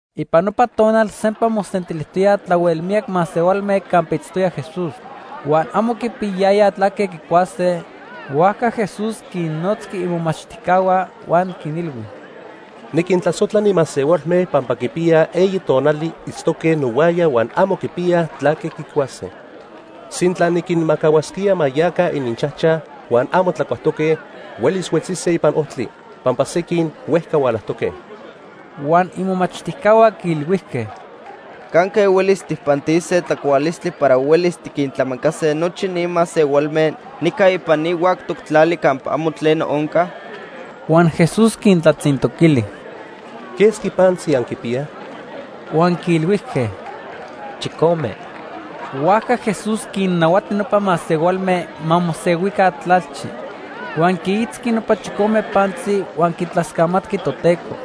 Ipan nopa tonal sempa mosentilijtoyaj tlahuel miyac masehualme campa itztoya Jesús. Huan amo quipiyayayaj tlaque quicuase, huajca Jesús quinnotzqui imomachtijcahua huan quinilhui: —Niquintlasojtla ni masehualme pampa quipiya eyi tonali itztoque nohuaya huan amo quipiyaj tlaque quicuase. Sintla niquinmajcahuasquía ma yaca ininchajchaj huan amo tlacuajtoque, huelis huetzise ipan ojtli, pampa sequin huejca hualajtoque. Huan imomachtijcahua quiilhuijque: —¿Canque huelis tijpantise tlacualistli para huelis tiquintlamacase nochi ni masehualme nica ipan ni huactoc tlali campa amo tleno onca? Huan Jesús quintlatzintoquili: —¿Quesqui pantzi anquipiyaj? Huan quiilhuijque: —Chicome. Huajca Jesús quinnahuati nopa masehualme ma mosehuica tlalchi. Huan quiitzqui nopa chicome pantzi huan quitlascamatqui Toteco.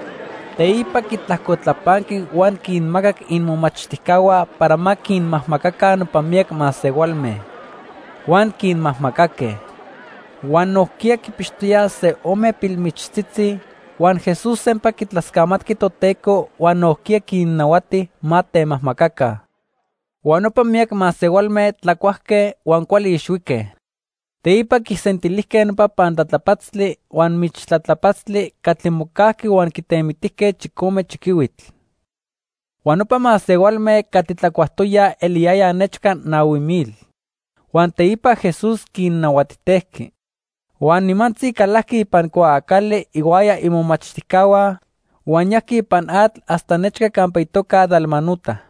Teipa quitlajcotlapanqui huan quinmacac imomachtijcahua para ma quinmajmacaca nopa miyac masehualme. Huan quinmajmacaque. Huan nojquiya quipixtoyaj se ome pilmichtzitzi, huan Jesús sempa quitlascamatqui Toteco huan nojquiya quinnahuati ma temajmacaca. Huan nopa miyac masehualme tlacuajque huan cuali ixhuique. Teipa quisentilijque nopa pantlatlapatztli huan michtlatlapatztli catli mocajqui huan quitemitijque chicome chiquihuitl. Huan nopa masehualme catli tlacuajtoyaj eliyayaj nechca nahui mil. Huan teipa Jesús quinnahuatijtejqui. Huan nimantzi calajqui ipan cuaacali ihuaya imomachtijcahua, huan yajqui ipan atl hasta nechca campa itoca Dalmanuta.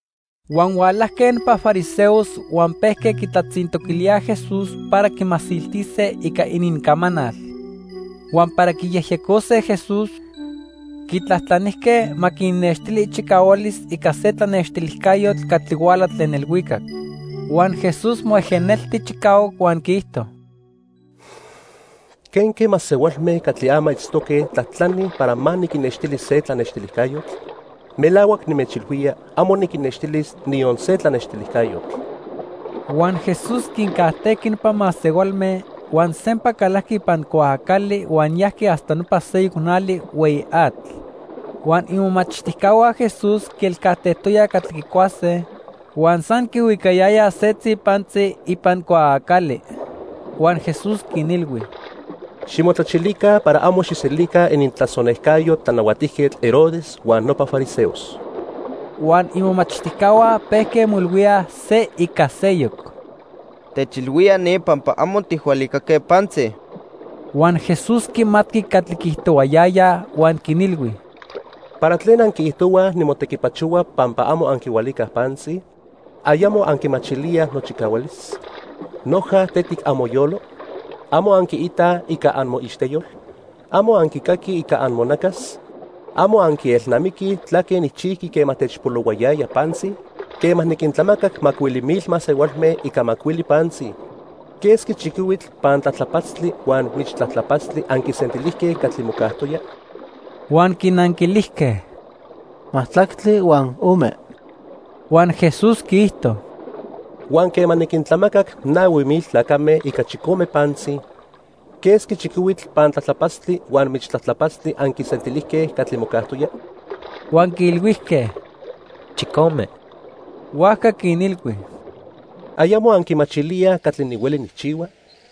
Huan hualajque nopa fariseos huan pejque quitlatzintoquilíaj Jesús para quimasiltise ica inincamanal. Huan para quiyejyecose Jesús, quitlajtlanijque ma quinnextili ichicahualis ica se tlanextilijcayotl catli huala tlen ilhuicac. Huan Jesús moejenelti chicahuac huan quiijto: —¿Quenque masehualme catli ama itztoque tlajtlanij para ma niquinnextili se tlanextilijcayotl? Melahuac nimechilhuía amo niquinnextilis niyon se tlanextilijcayotl. Huan Jesús quincajtejqui nopa masehualme, huan sempa calajqui ipan cuaacali huan yajqui hasta nopa seyoc nali hueyi atl. Huan imomachtijcahua Jesús quielcajtejtoyaj catli quicuase, huan san quihuicayayaj setzi pantzi ipan cuaacali. Huan Jesús quinilhui: —Ximotlachilica para amo xijselica inintlasonejcayo Tlanahuatijquetl Herodes huan nopa fariseos. Huan imomachtijcahua pejque moilhuíaj se ica seyoc: "Techilhuía ni pampa amo tijhualicaque pantzi." Huan Jesús quimatqui catli quiijtohuayayaj huan quinilhui: —¿Para tlen anquiijtohuaj nimotequipachohua pampa amo anquihualicaj pantzi? ¿Ayamo anquimachilíaj nochicahualis? ¿Noja tetic amoyolo? ¿Amo anquiitaj ica amoixteyol? ¿Amo anquicaquij ica amonacas? ¿Amo anquielnamiquij tlaque nijchijqui quema techpolohuayaya pantzi? Quema niquintlamacac macuili mil masehualme ica macuili pantzi, ¿quesqui chiquihuitl pantlatlapatztli huan michtlatlapatztli anquisentilijque catli mocajtoya? Huan quinanquilijque: —Majtlactli huan ome. Huan Jesús quiijto: —Huan quema niquintlamacac nahui mil tlacame ica chicome pantzi, ¿quesqui chiquihuitl pantlatlapatztli huan michtlatlapatztli anquisentilijque catli mocajtoya? Huan quiilhuijque: —Chicome. Huajca quinilhui: —¿Ayamo anquimachilíaj catli nihueli nijchihua?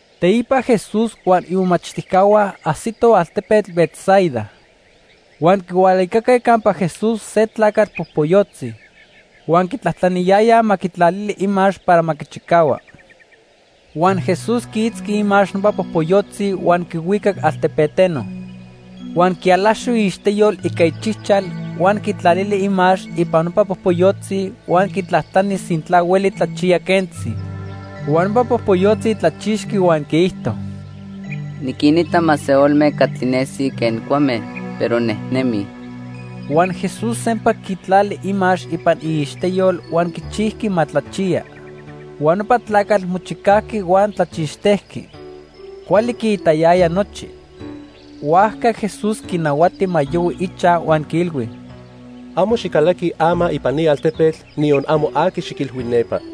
Teipa Jesús huan imomachtijcahua ajsitoj altepetl Betsaida. Huan quihualicaque campa Jesús se tlacatl popoyotzi. Huan quitlajtlaniyayaj ma quitlalili imax para ma quichicahua. Huan Jesús quiitzqui imax nopa popoyotzi huan quihuicac altepeteno. Huan quialaxo iixteyol ica ichijchal huan quitlali imax ipan nopa popoyotzi huan quitlajtlani sintla hueli tlachiya quentzi. Huan nopa popoyotzi tlachixqui huan quiijto: —Niquinita masehualme catli nesij quen cuame, pero nejnemij. Huan Jesús sempa quitlali imax ipan iixteyol huan quichijqui ma tlachiya. Huan nopa tlacatl mochicajqui huan tlachixtejqui. Cuali quiitayaya nochi. Huajca Jesús quinahuati ma yohui ichaj huan quiilhui: —Amo xicalaqui ama ipan ni altepetl niyon amo aqui xiquilhui nepa.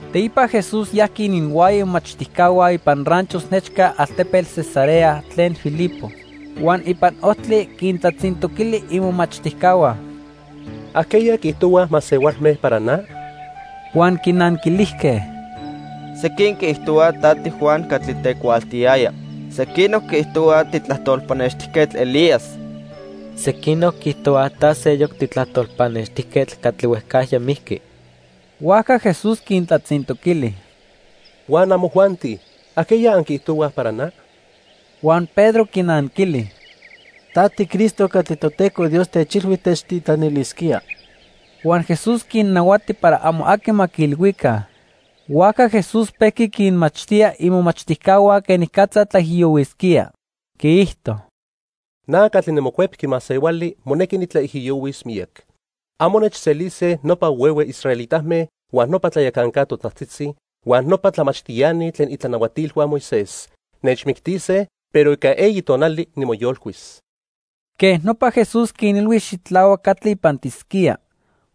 Teipa Jesús yajqui ininhuaya imomachtijcahua ipan ranchos nechca altepetl Cesarea tlen Filipo. Huan ipan ojtli quintlatzintoquili imomachtijcahua: —¿Ajqueya quiijtohuaj masehualme para na? Huan quinanquilijque: —Sequin quiijtohuaj ta tiJuan catli tecuaaltiyaya. Sequinoc quiijtohuaj titlajtol pannextijquetl Elías. Sequinoc quiijtohuaj ta seyoc titlajtol pannextijquetl catli huejcajya mijqui. Huajca Jesús quintlatzintoquili: —Huan amojuanti, ¿ajqueya anquiijtohuaj para na? Huan Pedro quinanquili: —Ta tiCristo catli Toteco Dios techilhui techtitlanilisquía. Huan Jesús quinnahuati para amo aqui ma quiilhuica. Huajca Jesús pejqui quinmachtía imomachtijcahua quenicatza tlaijiyohuisquía. Quiijto: —Na catli niMocuepqui Masehuali monequi nitlaijiyohuis miyac. Amo nechselise nopa huehue israelitame, huan nopa tlayacanca totajtzitzi, huan nopa tlamachtiani tlen itlanahuatilhua Moisés. Nechmictise, pero ica eyi tonali nimoyolcuis. Quej nopa Jesús quinilhui xitlahuac catli ipantisquía.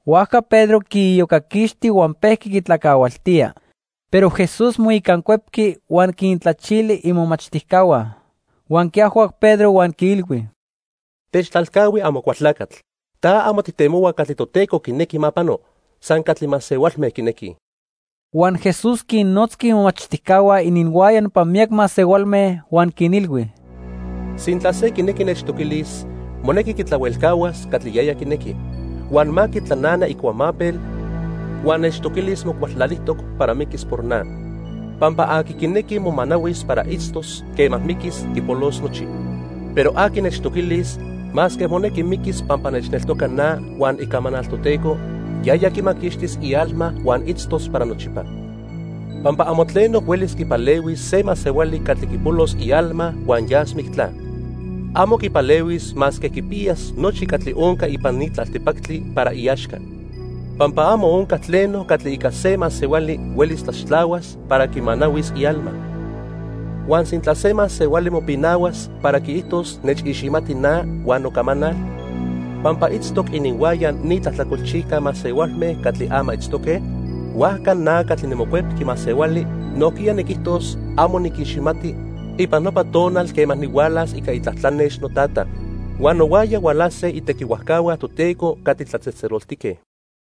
Huajca Pedro quiiyocaquixti huan pejqui quitlacahualtía. Pero Jesús moicancuepqui huan quintlachili imomachtijcahua. Huan quiajhuac Pedro huan quiilhui: —Techtlalcahui, Amocualtlacatl. Ta amo tijtemohua catli Toteco quinequi ma pano, san catli masehualme quinequij. Huan Jesús quinnotzqui imomachtijcahua ininhuaya nopa miyac masehualme huan quinilhui: —Sintla se quinequi nechtoquilis, monequi quitlahuelcahuas catli yaya quinequi. Huan ma quitlanana icuamapel huan nechtoquilis mocualtlalijtoc para miquis por na. Pampa aqui quinequi momanahuis para itztos, quema miquis, quipolos nochi. Pero aqui nechtoquilis masque monequi miquis pampa nechneltoca na huan icamanal Toteco, yaya quimaquixtis ialma huan itztos para nochipa. Pampa amo tleno huelis quipalehuis se masehuali catli quipolos ialma huan yas mictla. Amo quipalehuis masque quipiyas nochi catli onca ipan ni tlaltipactli para iaxca. Pampa amo onca tleno catli ica se masehuali huelis tlaxtlahuas para quimanahuis ialma. Huan sintla se masehuali mopinahuas para quiijtos nechiximati na huan nocamanal, pampa itztoc ininhuaya ni tlajtlacolchijca masehualme catli ama itztoque, huajca na catli niMocuepqui Masehuali nojquiya niquijtos amo niquiximati ipan nopa tonal quema nihualas ica itlatlanex noTata; huan nohuaya hualase itequihuajcahua Toteco catli tlatzejtzeloltique.